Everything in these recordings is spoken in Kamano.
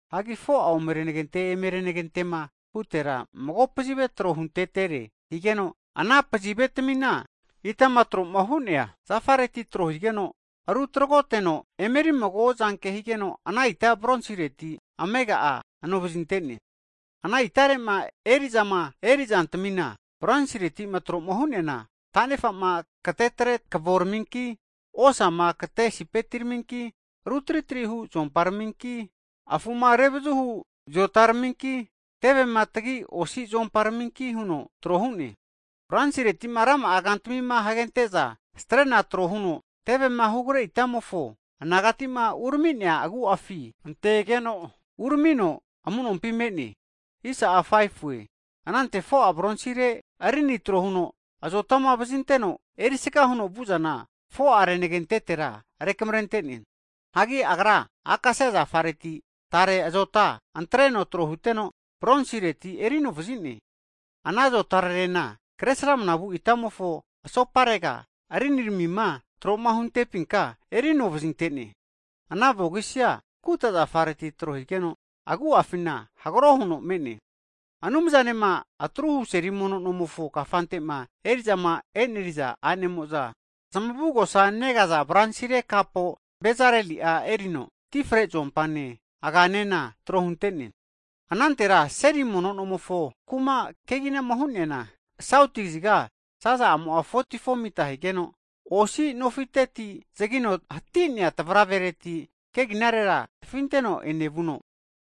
Hanki 4'a omerenagente eme renagente'ma hutera mago pazive tro huntetere higeno, ana pazivetamina itama tro'ma hu'neana zafareti tro higeno rutragote no erimago zanke higeno, ana ita bronsireti amega'a anovazinte'ne. Ana itare'ma eri'zama eri'zantamina bronsireti tro'ma hu'neana, tanefa'ma katetre kavoraminki, osama kate sipetiraminki, ru tritri hu zuomparaminki, afu'ma revazuhu zotaraminki, tevema tagi osi zuomparaminki huno tro hu'ne. Bronsireti rama'a kantami hagente'za strena tro huno tevema hugre itamofo anagati'ma urami'nea agu'afi antegeno uramino amu'nompi me'ne. Anante 4'a bronsire rini tro huno azotama vazinteno erisga huno vu'zana 4'a renagentetera rukamre'ne. Hagi agra akasia zafareti tare azota antreno tro huteno bronsireti eri anovazine. Ana azotarerena kresramna vu itamofo asoparega riniramima tro'ma huntepinka erino vazinte'ne. Ana vogisi'a kuta zafareti tro higeno, agu'afina hagro huno me'ne. Anumzanema atruhu seli mono nomofo kafante'ma eri'zama e'neri'za a'nemo'za zmavugosa negaza bronsire kapo Bezaleli'a erino, ti fre zuompane aga'anena tro hunte'ne. Anantera seli mono nomofo kuma keginama hu'neana, sauti kaziga zaza'amo'a 44'a mita higeno osi nofiteti zagino hati'nea tavaravereti keginarera tafinteno enevuno,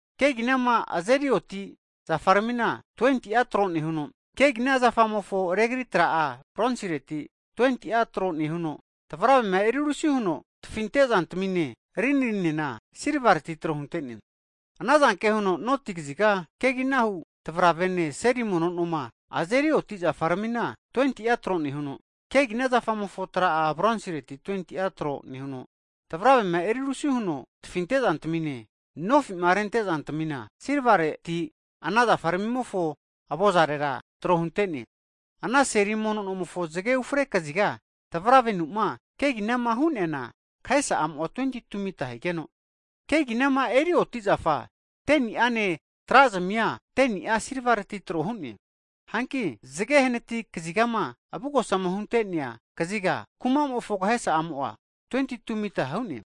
Keginama azeri oti zafaramina 20'a tro nehuno, kegina zafamofo regri tra'a bronsireti 20'a tro nehuno, tavravema erirusi huno tafinte'zantamine rininena silvareti tro hunte'ne. Ana zanke huno noti kaziga keginahu tavravene seli mono noma azeri oti zafaramina 20'a tro nehuno, kegina zafamofo tra'a bronsireti 20'a tro nehuno, tavravema erirusi huno tafinte'zantamine nofi'ma rente'zantamina silvareti ana zafaramimofo avozarera tro hunte'ne. Ana seli mono nomofo zage ufre kaziga tavravenu'ma keginama hu'neana kahesa'amo'a 22'a mita higeno, keginama eri oti'zafa 10ni'ane tra zamia, 10ni'a silvareti tro hu'ne. Hanki zage hanati kazigama avugosama hunte'nea kaziga kuma'mofo kahesa'amo'a 22'a mita hu'ne.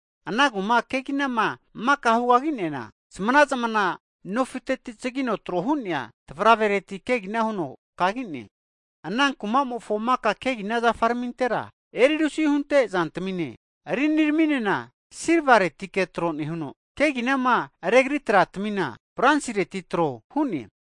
Ana kuma keginama maka hugagi'neana zmana'zmana nofiteti zagino tro hu'nea tavravereti kegina huno kagi'ne. Ana kumamofo maka kegina zafaramintera, erirusi hunte zantamine riniraminena silvaretike tro nehuno, keginama regri tratamina bronsireti tro hu'ne.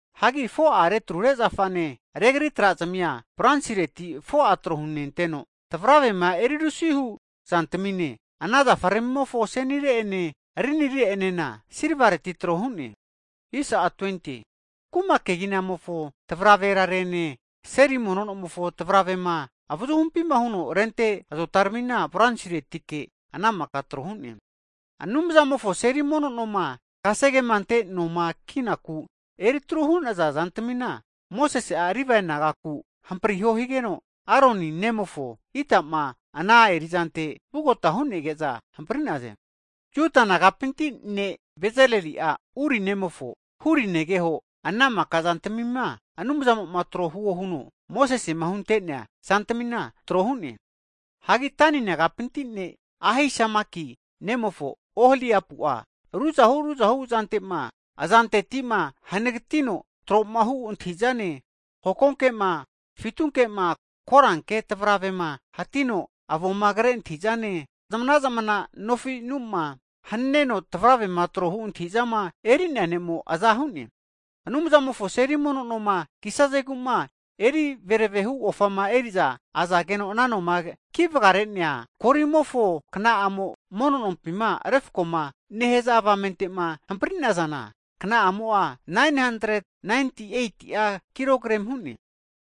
Hagi 4'a retrure zafane regri tra'zamia bronsireti 4'a tro hunenteno tavravema erirusihu zantamine, ana zafaramimofo asenire ene rinire'enena silvareti tro hu'ne. Kuma keginamofo tavraverarene seli mono nomofo tavravema avazuhumpi huno rente azotaramina bronsiretike ana maka tro hu'ne. Anumzamofo seli mono noma kasegema ante noma kinaku eritru hu'naza zantamina, Mosesi'a Livae nagaku hampriho higeno, Aroni ne'mofo Itama ana eri'zantera vugota hu'nege'za hampri'naze. Juda nagapinti ne' Bezaleli'a Uri ne'mofo Huri negeho ana maka zantmima Anumzamo'ma tro huo huno Mosese'ma hunte'nea zantamina tro hu'ne. Hagi Dani nagapinti ne' Ahisamaki ne'mofo Oholiapu'a ruzahu ruzahu zante'ma azanteti'ma hanagatino tro'ma hu antahi'zane, hokonke'ma, fitunke'ma, koranke tavravere'ma hatino avoma kre antahi'zane, zmana'zmana nofinu'ma haneno tavrave'ma trohu antahi'zama eri'nea ne'mo aza hu'ne. Anumzamofo seli mono noma kisazegu'ma eri vereve hu ofama eri'za azageno ana noma kivagare'nea golimofo kna'ama monompima refko'ma nehaza avamente'ma hampri'nazana, kna'amo'a 998'a kilogremi hu'ne.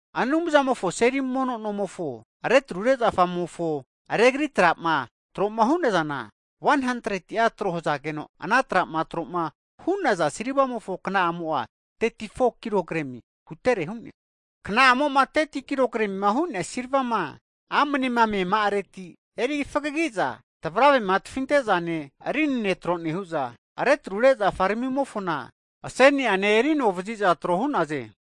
Anumzamofo seli mono nomofo retrure zafaramimofo regri tra'ama tro'ma hu'nazana, 100'a tro hazageno, ana tra'ma tro'ma hu'naza silvamofo kna'amo'a 34'a kilogremi huterere hu'ne. Kna'amo'ma 30'a kilogremima hu'nea silvama amnema meama'areti, eri fagagi'za tavravema tafinte'zane, rinine tro nehu'za retrure zafaramimofona aseni'anena erinovaziza tro hu'naze.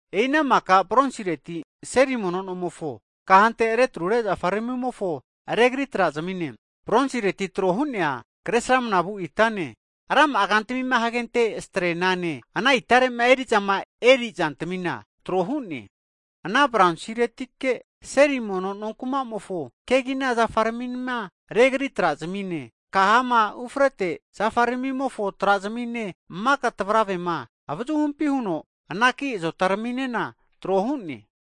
E'i ana maka bronsireti seli mono nomofo kahante retrure zafaramimofo regri trazamine, bronsireti tro hu'nea Kresramanavu itane, rama'a kantami hagente strenane, ana itare'ma eri'zama eri zantamina tro hu'ne. Ana bronsiretike seli mono nonkuma'mofo kegina zafaramima regri tra zamine, kahama ufrete zafaramimofo tra zami'ne, maka tvaravema avazuhumpi huno anaki azotaraminena tro hu'ne.